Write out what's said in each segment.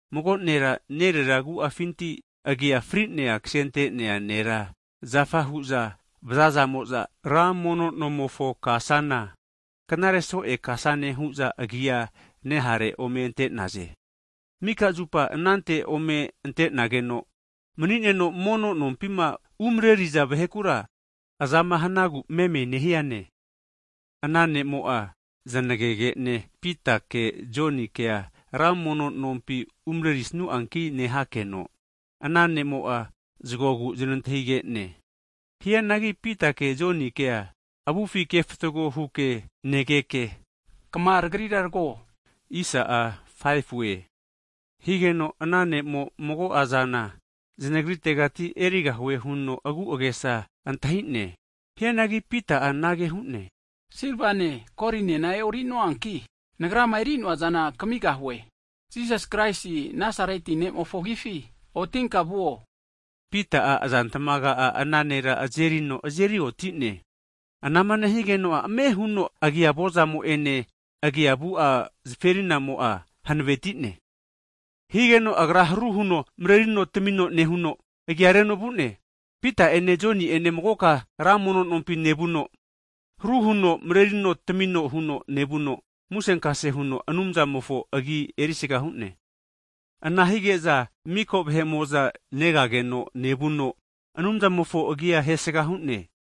mago nera, nerera agu'afinti agia frinea ksente'nea nera zafa hu'za vazaza'mo'za ra mono nomofo kasana, knare so'e kasane hu'za agia nehare ome ante'naze. Mika zupa anante ome ante'nageno mani'neno, mono nompima umreriza vahekura, azama hanagu meme nehiane. Ana nemo'a znagege'ne Pita'ene Jonikea ra mono nompi umreri'snuanki nehakeno, ana ne'mo'a zgogu znantahige'ne. Hianagi Pitake Jonikea avufi kefatago huke negeke, kma tagrira tago! Huno Pita'a hu'ne. Higeno, ana ne'mo mago'a zana zanagritegati erigahue huno agu'agesa antahi'ne. Hianagi Pita'a anage hu'ne, silvane, kolinena e'ori'noanki, nagrama eri'noazana kamigahue. Jisas Kraisi Nazareti ne'mofo agifi, otinka vuo! Nehuno Pita'a azantmaga'a ana nera azerino azerioti'ne. Anama nehigeno'a ame' huno agia avozamo'ene, agia avu'a zaferinamo'a hanaveti'ne. Higeno agra haru huno marerino tamino nehuno, agia reno vu'ne. Pita'ene Joni'ene magoka ra mono'nompi nevuno, haru huno marerino tamino huno nevuno, musenkase huno Anumzamofo agi erisaga hu'ne. Ana hige'za miko vahe'mo'za negageno nevuno, Anumzamofo agia hesga hu'ne,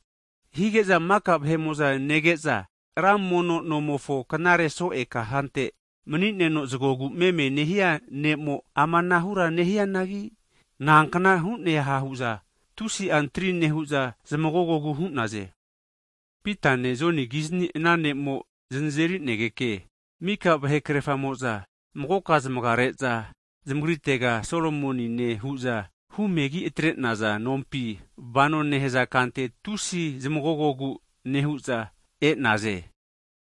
hige'za mika vahe'mo'za nege'za, ra mono (tempol) nomofo knare so'e kasante mani'neno zagogu meme nehia ne'mo amanahura nehianagi, nankna hu'neha hu'za tusi'a antri nehu'za zamagogogu hu'naze. Pitane Joni kizni ana ne'mo zanazeri'negeke, mika vahe krerfamo'za magoka zamagare'za zamagritega Solomonine hu'za humegi atre'naza nompi, vano nehaza kante tusi zamagogogu nehu'za e'naze.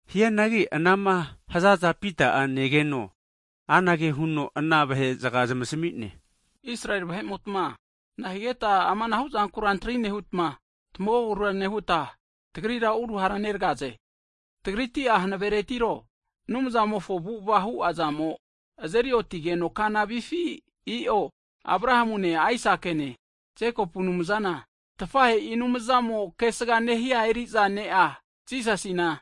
Hianagi anama hazaza Pita'a negeno, anage huno ana vahe'zga zamasmi'ne, Israeli vahe'motma nahigeta amanahu zankura antri nehutma, tamagogogura nehuta, tagrira uruhara neragaze? Tagritia hanaveretiro, Anumzamofo avu'ava hu'azamo azeri otigeno kana vifi? I'o, Abrahamune, Aisakine, Jekopu Anumzana tafahe'i Anumzamo kesga nehia eri'za Ne'a Jisasina,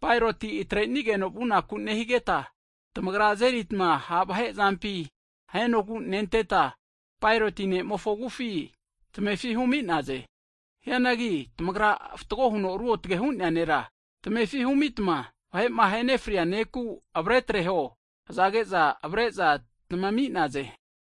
Paeroti atrenigeno vunaku nehigeta, tamagra ma azeritma ha' vahe azampi ahenogu nenteta, Paeroti ne'mofo avufi tamefi humi'naze. Hianagi tamagra fatgo huno ruotge hu'nea Nera, tamefi humitma vahe'ma ahenefria neku avare atreho, hazage'za avare'za tamami'naze.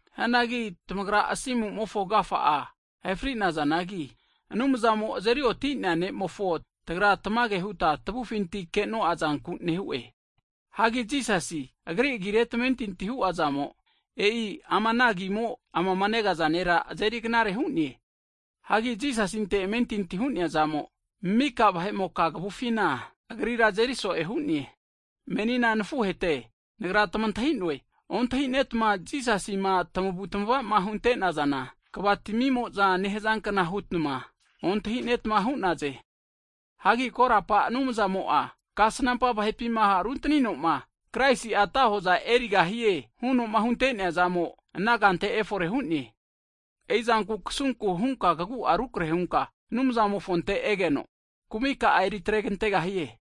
Hagi tamagra Asimu'mofo agafa ahe fri'nazanagi, Anumzamo azerioti nemofo, tagra tamage huta tavufinti ke'no'a zanku nehu'e. Hagi Jisasi, Agri agire tamentinti hu'azamo, e'i ama ana agimo amama negaza nera azeri knare hu'ne. Hagi Jisasinte amentinti hu'nea zamo, mika vahe'moka kavufina agrira azeri so'e hu'ne. Menina nafuhete, nagra tamantahi'noe, ontahinetma Jisasima tamavutamavama hunte'nazana, kva tamimo'za nehazankna hutma ontahi'netma hu'naze. Hagi korapa Anumzamo'a, Kasnampa vahepima runtaninoma, Kraisia ata hoza erigahie hu'noma hunte'neazamo, ana kante efore hu'ne. E'i zanku, kasunku hunka kagu'a rukarehe hunka, Anumzamofonte egeno, kumika'a eri atregantegahie.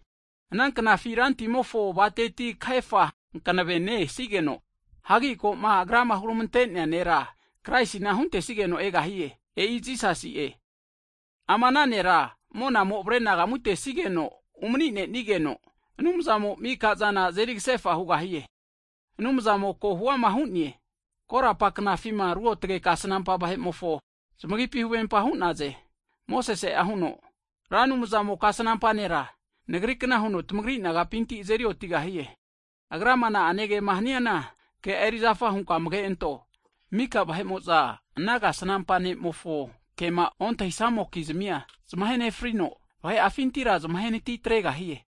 Ana knafi Rantimofo avateti kahefa hanave ne'e sigeno, hagi ko'ma Agra'ma huramante'nea nera Kraisina huntesigeno egahie. E'i Jisasi'e. Ama ana Nera monamo avare'anagamu tenesigeno umani'nenigeno, Anumzamo'a mika zana azeri kasefa hugahie, Anumzamo ko' huama hu'ne, korapa knafima ruotge kasnampa vahe'mofo zamagipi huvempa hu'naze. Mosese'a huno, Ra Anumzamo'a kasnampa nera nagrikna huno tamagri nagapinti azeri otigahie. Agrama na'ane kema haniana, ke'a erizafa hunka amage anto. Mika vahe'mo'za ana kasnampa ne'mofo kema ontahisnamo'kizmia, zamahe nefrino, vahe'afintira zamahenati tregahie.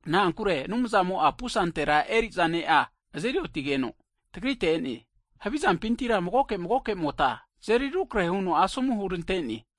Na'ankure Anumzamo'a pusante eri'za Ne'a azeri otigeno tagrite e'ne, havi zampintira magoke magoke'mota, tazeri rukarahe huno asomu hurante'ne.